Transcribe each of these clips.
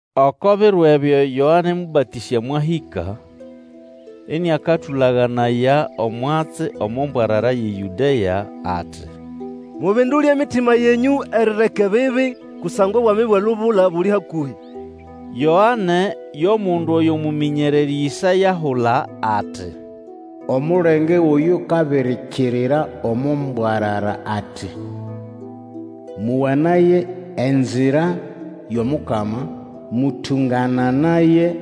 Oko biro ebyo Yoane Mũbatĩsya mwahĩka, iniakatũlaganaya omwatsi omo mbwarara yʼeYũdea, ati, Mubindule emitima yenyũ erireka ebibi, kusangwa obwami bwʼelubula buli hakũhĩ! Yoane yo mundu oyo mũmĩnyererĩ Ĩsaya ahula ati, Omulenge wʼoyukabirikirira omo mbwarara ati, Mowanaye enzira yʼomukama, Mũtũngananaye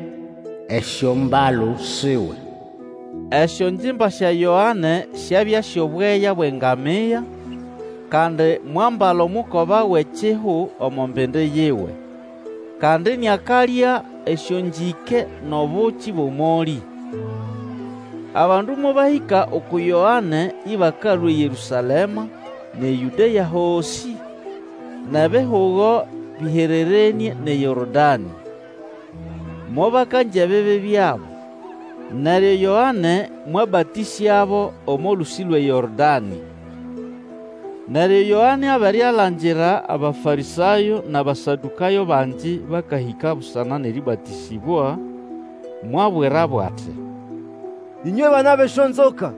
esyombalu siwe! Esyongimba sya Yoane syabya syʼobweya bwʼengamia, kandi mwambala omukoba wʼekihu omo mbindi yiwe, kandi iniakalya esyongĩke nʼobuki bwʼomolĩ. Abandu mobahĩka uku Yoane ĩbakalũa eYerũsalema, nʼeYũdea hosĩ, nʼebihugo bĩhererenĩe nʼeYorodanĩ. Mobakangya ebibi byabo, neryo Yoane mwabatĩsyabo omo lũsĩ lwʼeYorodanĩ. Neryo Yoane abere alangira Abafarĩsayo nʼAbasadũkayo bangi bakahĩka busana nʼerĩbatĩsĩbwa, mwabwirabo ati, Ĩnywe bana bʼesyonzoka,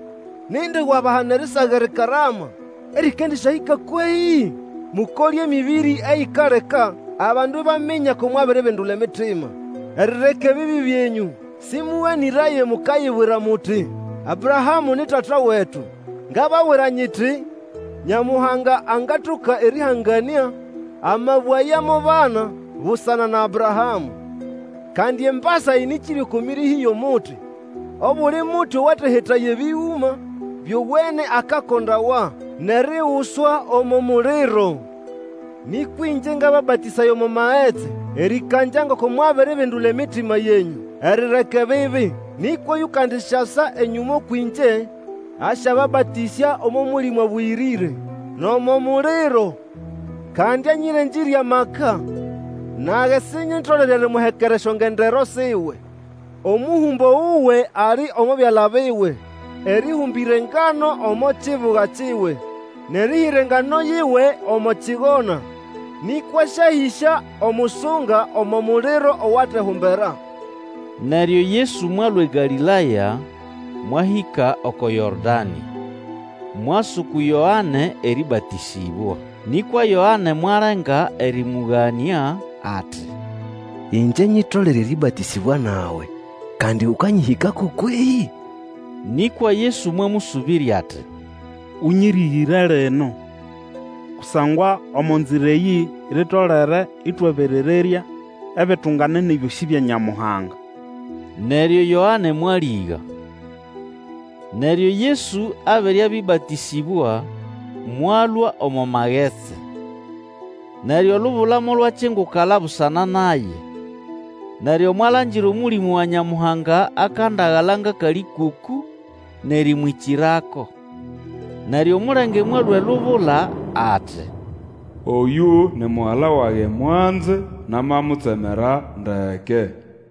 nindi wabahana erisaga erikarama erĩkandĩsyahĩka kwehĩ? Mukole emĩbĩrĩ eyikaleka abandu ibaminya ko mwabiribindula emitima erireka ebibi byenyũ. Sĩmũganĩraye mukayibwira muti, Abrahamũ ni tata wetu. Ngababwira nyiti, Nyamuhanga angatoka erĩhanganĩa amabwe aya mo bana busana na Abrahamũ. Kandi embasa ĩnĩkĩrye oko mĩrĩhĩ yʼomuti. Obuli muti owatehetaya ebĩgũma byowene akakondawa nʼeriguswa omo muliro. Nĩkwa ĩngye ngababatĩsaya omo magetsi erĩkangya ngoko mwabiribindula emitima yenyũ erireka ebibi; nĩkwa oyukandisyasa enyũma kwĩngye asyababatĩsya omo Mũlĩmũ Abũyĩrĩre nʼomo muliro. Kandi anyĩrengĩrye maka, nage sinyitolere erimuhekera esyongendero siwe. Omũhũmbo wuwe ali omo byala biwe erĩhũmbĩra engano omo kibuga kiwe nʼerĩhĩra engano yiwe omo kigona, nĩkwa asyahĩsya omusunga omo muliro owatehumbera. Neryo Yesu mwalũa eGalĩlaya mwahĩka oko Yorodanĩ, mwasa uku Yoane erĩbatĩsĩbwa. Nĩkwa Yoane mwalenga erĩmũganĩa, ati, Ĩngye nyitolere erĩbatĩsĩbwa nawe, kandi ũkanyĩhĩkako kwehĩ? Nĩkwa Yesu mwamũsũbĩrya ati, Ũnyĩrĩgĩre lino. Kusangwa omo nzira eyĩ litolere ĩtwaberererya ebitunganene byosĩ bya Nyamuhanga. Neryo Yoane mwalĩga. Neryo Yesu abere abĩbatĩsĩbwa, mwalũa omo magetsi. Neryo olubula molwakingukala busana naye, neryo mwalangira Omũlĩmũ wa Nyamuhanga akandagala ngʼakalĩkũkũ, nʼerĩmwĩkĩrako. Neryo omulenge mwalũa elubula ati, Oyũ ni Mugala wage mwanze, namamutsemera ndeke.